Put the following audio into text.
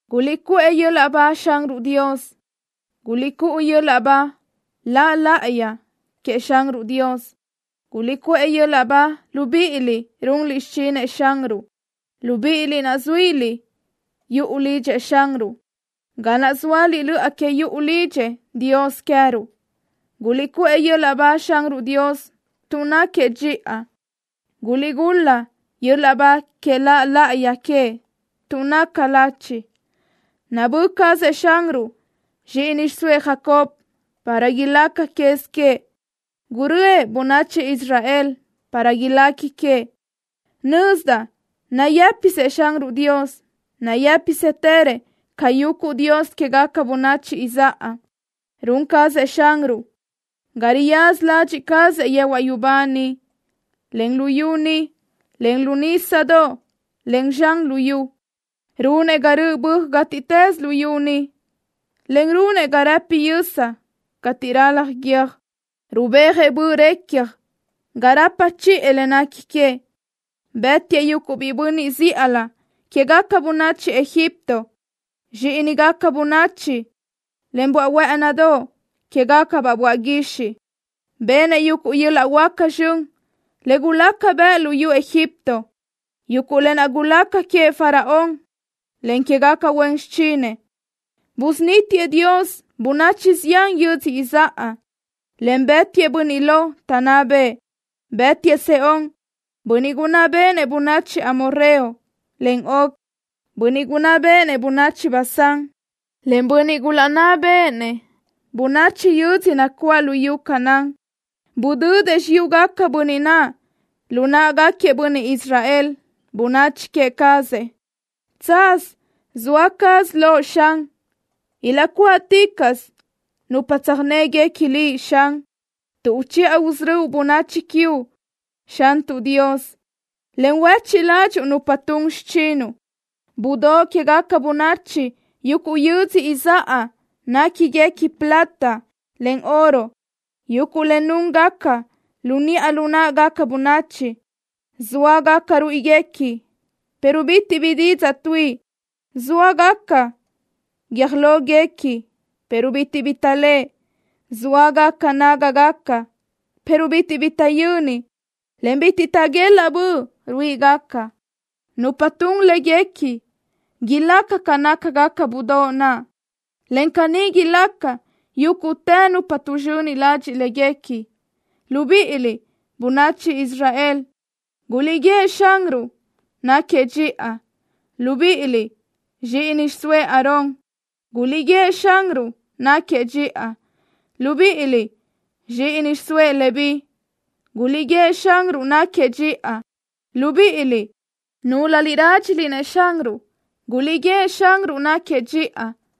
¡Guliʼcuʼë yöl-laʼ ba Xanruʼ Dios! ¡Guliʼcúʼu yöl-laʼ ba La laʼayi queëʼ Xanruʼ Dios! ¡Guliʼcuʼë yöl-laʼ ba, libíʼiliʼ runliʼ xichinëʼ Xanruʼ, libíʼiliʼ naʼ zuíliʼ yuʼu lidxëʼ Xanruʼ, ga naʼ zóaliʼ löʼa que yuʼu lidxëʼ Dios queëruʼ! ¡Guliʼcuʼë yöl-laʼ ba Xanruʼ Dios tuʼ náquiëʼ dxiʼa! ¡Guliʼgul-la yöl-laʼ ba que La laʼayi queëʼ, tuʼ naca lachi! Nabö́ cazëʼ Xanruʼ zxíʼini xiʼsóëʼ Jacob para ilaca quez queëʼ. Gurö́ëʼ bönachi Israel para ilequi queëʼ. Nözdaʼ nayë́pisëʼ Xanruʼ Dios. Nayë́pisëtërëʼ ca yuguʼ dios quégaca bönachi izáʼa. Run cazëʼ Xanruʼ ca riyaza ladxiʼ cazëʼ yehuaʼ yubá niʼ, en luyú ni, en lu nísadoʼ, en zxan lu yu. Runëʼ ga röʼ böaj gátiʼtës luyú ni, en runëʼ ga rëpi yösa cateʼ ralaj guiö́j. Rubéajëʼ böʼ recja ga rapa chiʼë le nequi queëʼ. Bë́tiëʼ yuguʼ biʼi bönniʼ zíʼalö quégaca bönachi Egipto, zxíʼinigaca bönachi, en böaʼ huë́ʼënidoʼ quégacabaʼ böaʼ guixiʼ. Benëʼ yuguʼ yöl-laʼ huáca zxön le gulaca bëʼ luyú Egipto, yuguʼ lë naʼ gulaca queëʼ Faraón, en quégaca huen xichinëʼ. Busunítiëʼ Dios bönachi zián yödzö izáʼa, en bë́tiëʼ bönniʼ lo taʼnná bëʼë. Bë́tiëʼ Sehón, bönniʼ gunná béʼenëʼ bönachi Amorreo, en Og, bönniʼ gunná béʼenëʼ bönachi Basán, en bönniʼ gulaʼnná béʼenëʼ bönachi yödzö nacuáʼ luyú Canaán. Budödëʼ xiyúgaquiëʼ bönniʼ naʼ lu náʼagaquiëʼ bönniʼ Israel, bönachi queë cazëʼ. Tsaz zoa caz Loʼ, Xan. Ilaʼcuáʼticaʼsö nupa tsöjnégaca Liʼ, Xan, tuʼ uchiʼa usörö́uʼ bönachi queuʼ, Xantuʼ Dios, en huéchiʼ ládxuʼu nupa tun xichinuʼ. Budóʼ quégaca bönachi yuguʼ yödzö izáʼa néquiniguequi plata, en oro, yuguʼ le núngaca lu niʼa lu náʼagaca bönachi. Zóagaca ruíʼiguequi, pero bitiʼ bi didzaʼ tuíʼi. Zóagaca guiö́j lóguequi, pero bitiʼ bi taʼléʼe. Zóagaca nágagaca, pero bitiʼ bi taʼyöni, en bitiʼ taʼguelaʼ böʼ ruíʼigaca. Nupa tun léguequi ilaca ca nácagaca budóʼ naʼ, en caní ilaca yúguʼtë nupa tuʼzxöni ladxiʼ léguequi. Libíʼiliʼ, bönachi Israel, guliʼguíëʼ Xanruʼ náquiëʼ dxiʼa. Libíʼiliʼ, zxíʼini xiʼsóëʼ Aarón, guliʼguíëʼ Xanruʼ náquiëʼ dxiʼa. Libíʼiliʼ, zxíʼini xiʼsóëʼ Leví, guliʼguíëʼ Xanruʼ náquiëʼ dxiʼa. Libíʼiliʼ, núlöliʼ rádxiliʼ-nëʼ Xanruʼ, guliʼguíëʼ Xanruʼ náquiëʼ dxiʼa.